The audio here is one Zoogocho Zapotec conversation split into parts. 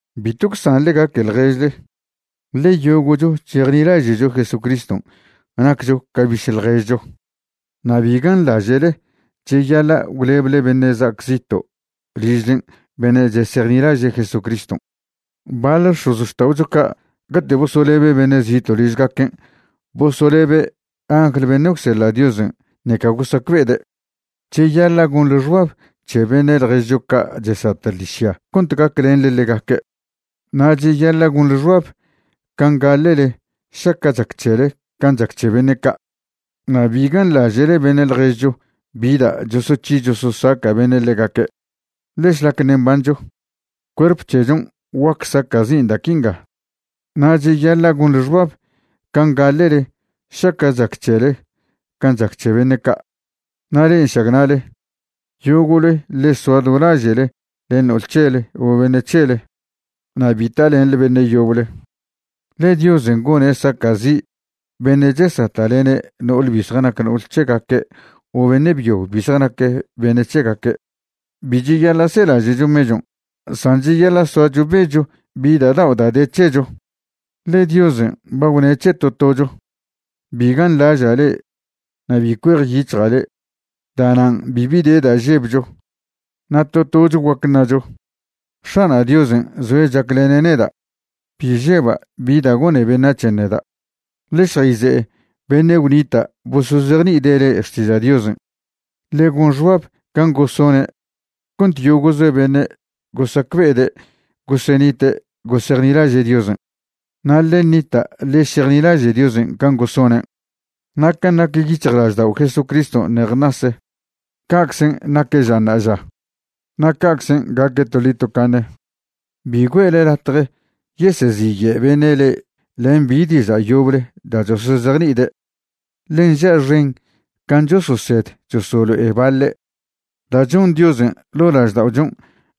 Bitw gwsanḻe gaque ḻježle, ḻe yogo'cho chejnilaže'cho Jesucriston' naccho ca biše' ḻježcho. Na' bi ganḻaže'le cheyaḻa' gwleble beṉe' za'ac zito' ližlen' beṉe' chesejnilaže' Jesucriston'. Baḻ x̱ozxta'ocho ca' cate' bosolebe' beṉe' zito' ližgaquen' bosolebe' angl beṉe' gwseḻa' Diosen' ṉeca gosacbe'ede'. Cheyaḻa' gonḻe xbab c̱he beṉe' ḻježcho ca' chesata' ḻižya cont gaclenḻe ḻegaque'. Na' cheyaḻa' gonḻe xbab can' gaḻe'le šaca' chac c̱hele can' chac c̱he beṉe' ca'. Na' bi ganḻaže'le beṉe' ḻježcho bi da' chosoc̱hi chososaca' beṉe' ḻegaque', ḻe šlac ṉe' mbancho, cuerp c̱hechon' guac saca'zin' da' quinga. Na' cheyaḻa' gonḻe xbab can' gaḻe'le šaca' chac c̱hele can' chac c̱he beṉe' ca'. Na' le'e nšagna'le, yogo'le ḻe soa do laže'le len no'ol c̱hele o beṉe' c̱hele na' bi talenḻe beṉe' yoble, ḻe Diosen' gone' saca'zi' beṉe' chesata'lene' no'ole bi zjanac no'ol c̱hegaque' o beṉe' byo bi zjanac beṉe' c̱hegaque'. Bi cheyaḻa' selaže'cho mechon', san cheyaḻa' soacho becho bi da' dao' da' de c̱hecho, ḻe Diosen' ba gwne' c̱he to tocho: “Bi ganḻaža' le' na' bi cuejyic̱hja' le'.” Da'nan' bibi de da' žebcho, na' to tocho guac ṉacho: X̱ana' Diosen' zoe' chaclene' neda'. Bi žeba' bi da' gone beṉac̱hen' neda'. Ḻe šjayze'e beṉe' gwnita' bosozejni'ide' le'e xtiža' Diosen'. Ḻe gon xbab can' gosone' cont yogo'ze beṉe' gosacbe'ede' gosenite' gosejnilaže' Diosen', na' ḻe ṉita' ḻe šejnilaže' Diosen' can' gosonen'. Na' can' nac yic̱hjlaždao' Jesucriston' ṉej ṉase, ca'czen' naque' ža ṉa'aža, na' ca'czen' gaque' toḻi tocaṉe. Bi güe'le latje yeseziye' beṉe' le'e len bi diža' yoble da' chosozejni'ide', ḻe nža' xen can' chososed chosolo'e baḻe'. Da' chon Diosen' ḻo' lažda'ochon'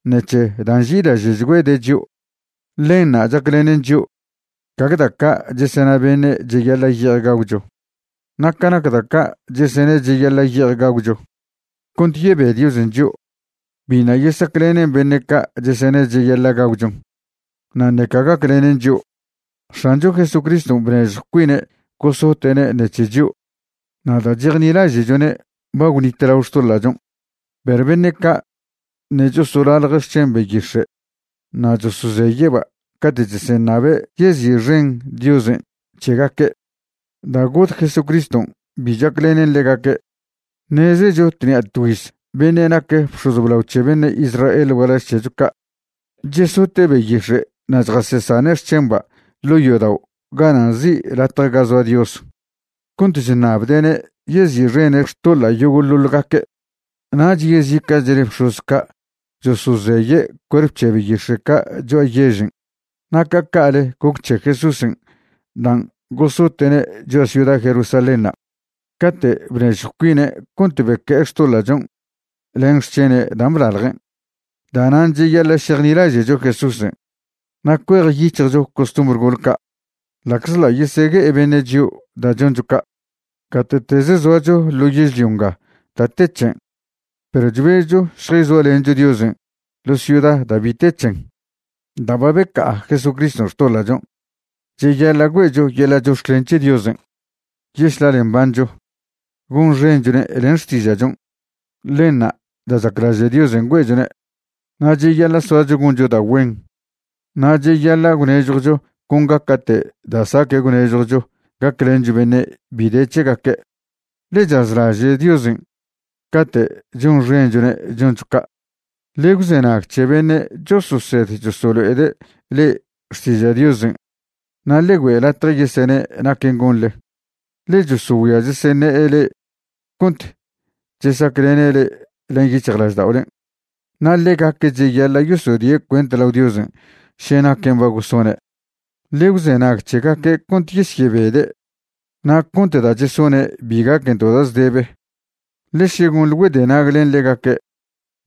ṉec̱he da' nži'ilaže'chgüede' chio', ḻenṉa' chaclenen chio', gague da' ca' chesena beṉe' cheyaḻa' ye'ej gagwcho. Na' ca nac da' ca' chesene' cheyaḻa' ye'ej gagwcho cont yebe Diosen' chio', biṉa' yesaclenen beṉe' ca' chesene' cheyaḻa' gagwchon, na' ṉeca gaclenen chio'. X̱ancho Jesucriston' bnežjw cuine' gosote'ne' ṉec̱he chio', na' da' chejnilaže'chone' ba gwnitlao xtoḻa'chon'; perw beṉe' ca' ṉe' chosolalje' xc̱hen beyix̱e' na' chosozeye'ba' cate' cheseṉabe' yezi'xen Diosen' c̱hegaque', da' got Jesucriston' bi chaclenen ḻegaque'. Ṉezecho tṉi'a tgüiz beṉe' nac bx̱oz blao c̱he beṉe' Israel gualaž c̱hecho ca' chesote' beyix̱e' na' chjasesane' xc̱hemba' ḻo' yodao' gana' nzi' Latje ga Zoa Dios cont chṉabde'ne' yezi'xene' xtoḻa' yogo'ḻoḻ gaque'. Nach yezica'chle bx̱oz ca' chosozeye' cuerp c̱he beyix̱e' ca' cho'a yežen'. Na' ca ca'le goc c̱he Jesúsen' dan' gosote'ne' cho'a ciuda Jerusalénṉa' cate' bnezjw cuine' cont beque'e xtoḻa'chon' len xc̱hene' dan' blaljen'. Da'nan' cheyaḻa' šejnilaže'cho Jesúsen' na' cuejyic̱hjcho costumbr gol ca', ḻa'czḻa' yesegue'e beṉe' chio' da' choncho ca'. Gate'tez zoacho ḻo yežlio nga da' te c̱hen, perw chbezcho šjayzoalencho Diosen' ḻo ciuda da' bi te c̱hen. Da' ba beca'a Jesucriston' xtoḻa'chon' cheyaḻa' güe'cho yeḻa' chox̱clen c̱he Diosen' yešlale mbancho, gonxenchone' len xtiža'chon'. Ḻenṉa' da' chaclaže' Diosen' güe'chone'. Na' cheyaḻa' soacho goncho da' güen na' cheyaḻa' gwnežjwcho con gaca'te da' saque' gwnežjwcho gaclencho beṉe' bi de c̱hegaque', ḻe chazlaže' Diosen' cate' chonxenchone' choncho ca'. Ḻe gwzenag c̱he beṉe' chososed cheselo'ede' le'e xtiža' Diosen' na' ḻe güe' latje yesene' naquen' gonḻe, ḻe chosogüia cheseṉe'e le'e cont chesaclene' le'e len yic̱hjlažda'olen', na' ḻegaque' cheyaḻa' yosyodie' cuent lao Diosen' še naquen' ba gosone'. Ḻe gwzenag c̱hegaque' cont yesyebede' na' cont da' chesone' bi gaquen to da' zdebe, ḻe še gonḻe güedenag len ḻegaque',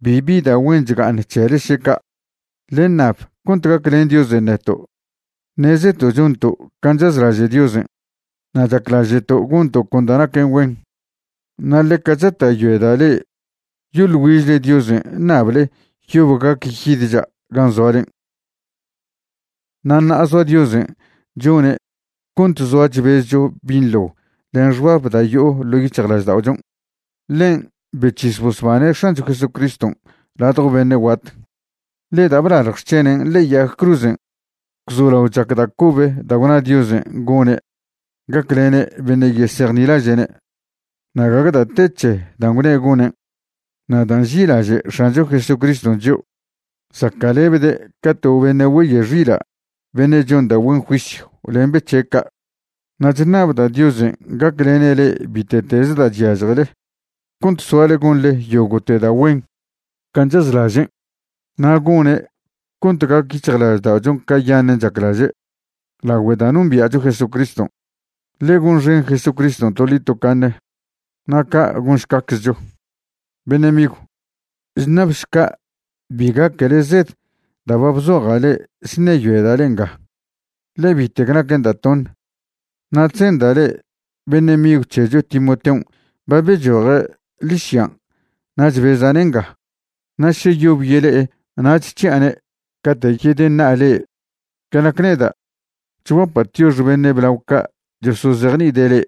bibi da' güen chga'aṉ c̱hele še ca'. Ḻe ṉab cont gaclen Diosen' neto'. Ṉezeto' chonto' can' chazlaže' Diosen' na' chaclaže'to' gonto' con da' naquen güen. Na' ḻeca chata'yoeda' le'e yoḻ güižle Diosen' ṉable yob gac yidcha' gan' zoalen'. Na' ṉa'a zoa Diosen' chone' cont zoa chbezcho binḻo len xbab da' yo'o ḻo' yic̱hjlažda'ochon'. Ḻen' bec̱his bosbane' X̱ancho Jesucriston' ladjo beṉe' guat, ḻe da' blalj xc̱henen' ḻe'e yag cruzen' gwzolao chac da' cobe da' gwna Diosen' gone' gaclene' beṉe' yesejnilaže'ne'; na' gague da' te c̱he dan' gwne' gonen'. Na' da' nži'ilaže' X̱ancho Jesucriston' chio', zaca'lebde' ca to beṉe' güeye' xila' beṉe' chon da' güen juisyw len be c̱he' ca'. Na' chṉabda' Diosen' gaclene' le'e bite'tez da' chyažjele cont soale gonḻe yogo'te da' güen can' chazlažen', na' gone' cont gac yic̱hjlažda'ochon' cayaṉen' chaclaže' lagüe da' nombia'cho Jesucriston'. Ḻe gonxen Jesucriston' toḻi tocaṉe. Na' ca' gonšcaczcho. Beṉe' migw, chṉabšca' bi gaquele zed da' ba bzoja' le'e chṉeyoeda' le'e nga, ḻe bitec naquen da' toṉe. Na' chzenda' le'e beṉe' migw c̱hecho Timoteon' ba bechoje' ḻižyan' na' chbeza'ne' nga. Na' še yob yele'e nach c̱hi'ane' cate' yedeṉa'a le'e. Ca nac neda', chguapa' tiox beṉe' blao ca' chosozejni'ide' le'e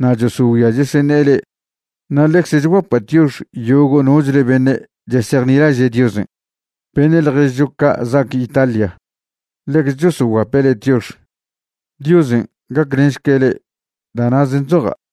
na' chosogüia cheseṉe'e le'e, na' ḻecze chguapa' tiox yogo' nochle beṉe' chesejnilaže' Diosen'. Beṉe' ḻježcho ca' za'ac Italia ḻecze chosoguape' le'e tiox. Diosen' gaclenšque' le'e. Da' na'zen' chzoja'.